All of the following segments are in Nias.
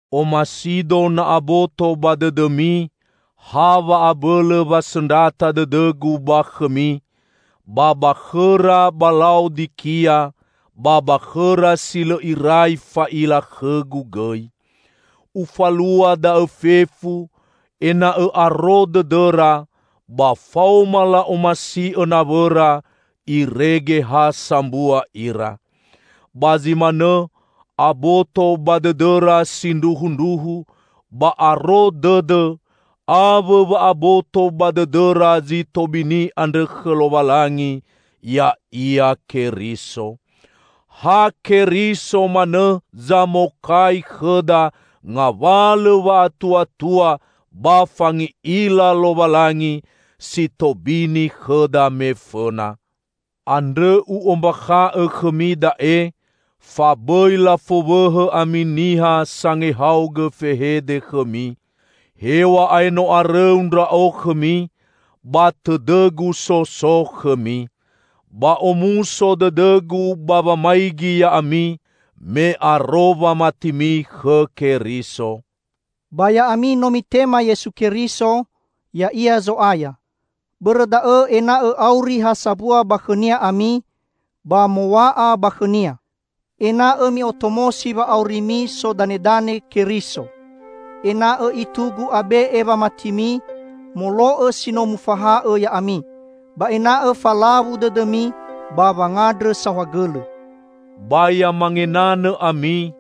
Omasido na aboto ba dõdõmi ha wa'abõlõ wasõndrata dõdõgu ba khõmi, ba ba khõra ba La'odikia, ba ba khõra si lõ irai fa'ila khõgu gõi. Ufalua da'õ fefu, ena'õ aro dõdõra, ba faoma la'omasi'õ nawõra, irege ha sambua ira. Ba zi manõ aboto ba dõdõra sindruhundruhu ba aro dõdõ, awõ wa aboto ba dõdõra zi tobini andrõ khõ Lowalangi, ya'ia Keriso. Ha Keriso manõ zamokai khõda ngawalõ wa'atuatua ba fangi'ila Lowalangi, si tobini khõda me fõna. Andrõ u'ombakha'õ khõmi da'e fa bõi lafowõhõ ami niha sangehaogõ fehede khõmi. Hew̃a'ae no arõu ndra'o khõmi, ba tõdõgu so so khõmi. Ba omuso dõdõgu ba wamaigi ya'ami, me aro wamatimi khõ Keriso. Ba ya'ami no mitema Yesu Keriso, ya'ia Zo'aya. Bõrõ da'õ ena'õ auri ha sambua ba khõ-Nia ami, ba mow̃a'a ba khõ-Nia. Ena'õ mi'otomosi wa'aurimi sodanedane Keriso. Ena'õ itugu abe'e wamatimi, molo'õ si no mufaha'õ ya'ami. Ba ena'õ falawu dõdõmi ba wangandrõ saohagõlõ. Ba ya mangenanõ ami,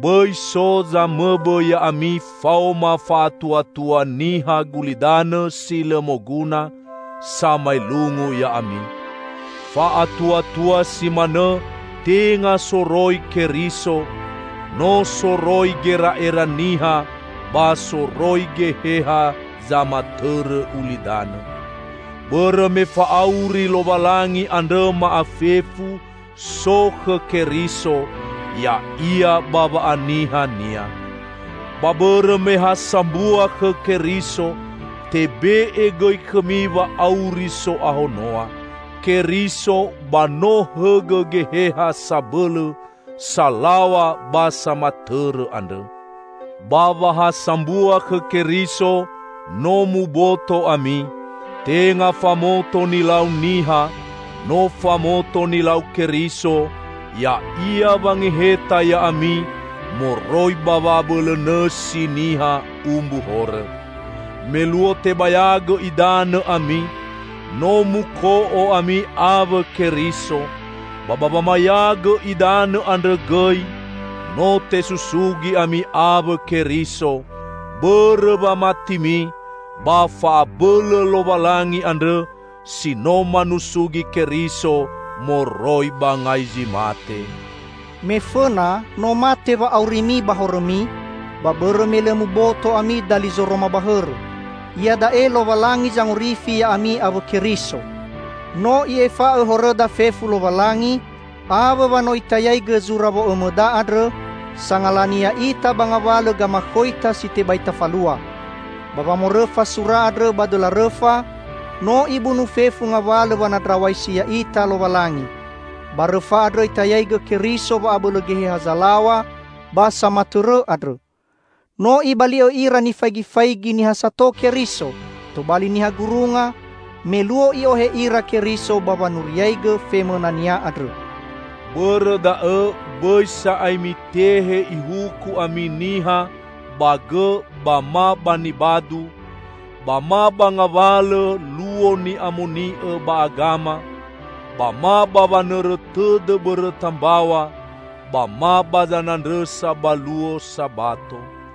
bõi so zamõbõ ya'ami faoma fa'atuatua niha gulidanõ si lõ moguna, samaelungu ya'ami. Fa'atuatua si manõ tenga soroi Keriso, no soroi gera'era niha ba soroi geheha zamatõrõ ulidanõ. Bõrõ me fa'auri Lowalangi andrõ ma'afefu, so khõ Keriso, ya'ia ba wa'aniha-Nia. Ba bõrõ me ha sambua khõ Keriso, tebe'e gõi khõmi wa'auri so'ahonoa. Keriso ba no hõgõ geheha sabõlõ (salaw̃a) ba samatõrõ andrõ. Ba wa ha sambua khõ Keriso, no muboto ami. Tenga famoto nilau niha, no famoto nilau Keriso, ya'ia wangeheta ya'ami moroi ba wa'abõlõ nõsi niha umbu horõ. Me luo tebayagõ idanõ ami, no muko'o ami awõ Keriso, ba ba wamayagõ idanõ andrõ gõi no tesusugi ami awõ Keriso, bõrõ wamatimi ba fa'abõlõ Lowalangi andrõ si no manusugi Keriso moroi ba ngai zi mate. Me fõna, no mate wa'aurimi ba horõmi, ba bõrõ me lõ muboto ami dali zoroma ba hõrõ. Iada'e Lowalangi zangorifi ya'ami awõ Keriso. No I'efa'õ horõda fefu Lowalangi, awõ wa no Itayaigõ zura wo'õmõda andrõ, sangalani ya'ita ba ngawalõ gamakhoita si tebai tafalua. Ba wamorõfa sura andrõ ba dõla rõfa, no Ibunu fefu ngawalõ wanandraw̃aisi ya'ita Lowalangi. Ba rõfa andrõ Itayaigõ Keriso wa'abõlõ geheha zalaw̃a ba samatõrõ andrõ. No Ibali'õ ira nifaigifaigi niha sato Keriso, tobali niha gurunga, me luo I'ohe ira Keriso ba wanuriaigõ femõna-Nia andrõ. Bõrõ da'õ bõi sa'ae mitehe ihuku ami niha ba gõ ba ma ba nibadu, ba ma ba ngawalõ luo ni'amoni'õ ba agama, ba ma ba wanõrõ tõdõ bõrõta mbaw̃a, ba ma ba zanandrõsa ba luo Sabato.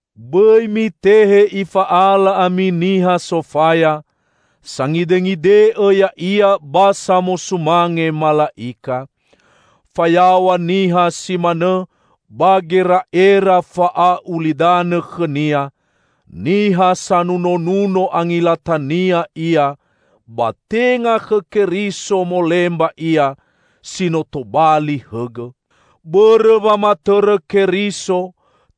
Bõi mitehe ifa'ala ami niha sofaya, sangidengide'õ ya'ia ba samosumange mala'ika. Fayaw̃a niha si manõ ba gera'era fa'a'ulidanõ khõnia, niha sanunonuno angilatania ia, ba tenga khõ Keriso molemba ia, si no tobali hõgõ. Bõrõ wamatõrõ Keriso,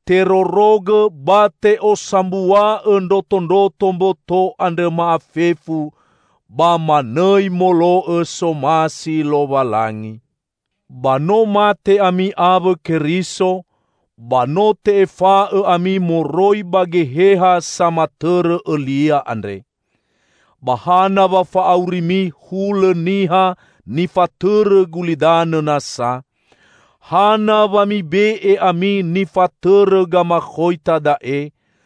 terorogõ ba te'osambua'õ ndrotondroto mboto andrõ ma'afefu, ba manõi molo'õ somasi Lowalangi. Ba no mate ami awõ Keriso, ba no te'efa'õ ami moroi ba geheha samatõrõ õlia andre. Ba hana wa fa'aurimi hulõ niha nifatõrõ gulidanõ nasa? Hana wa mibe'e ami nifatõrõ gamakhoita da'e,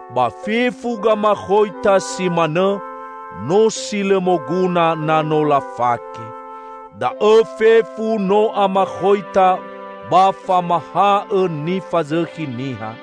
Ba fefu gamakhoita si manõ, no si lõ moguna na no lafake. Da'õ fefu no amakhoita ba famahaõ nifazõkhi niha.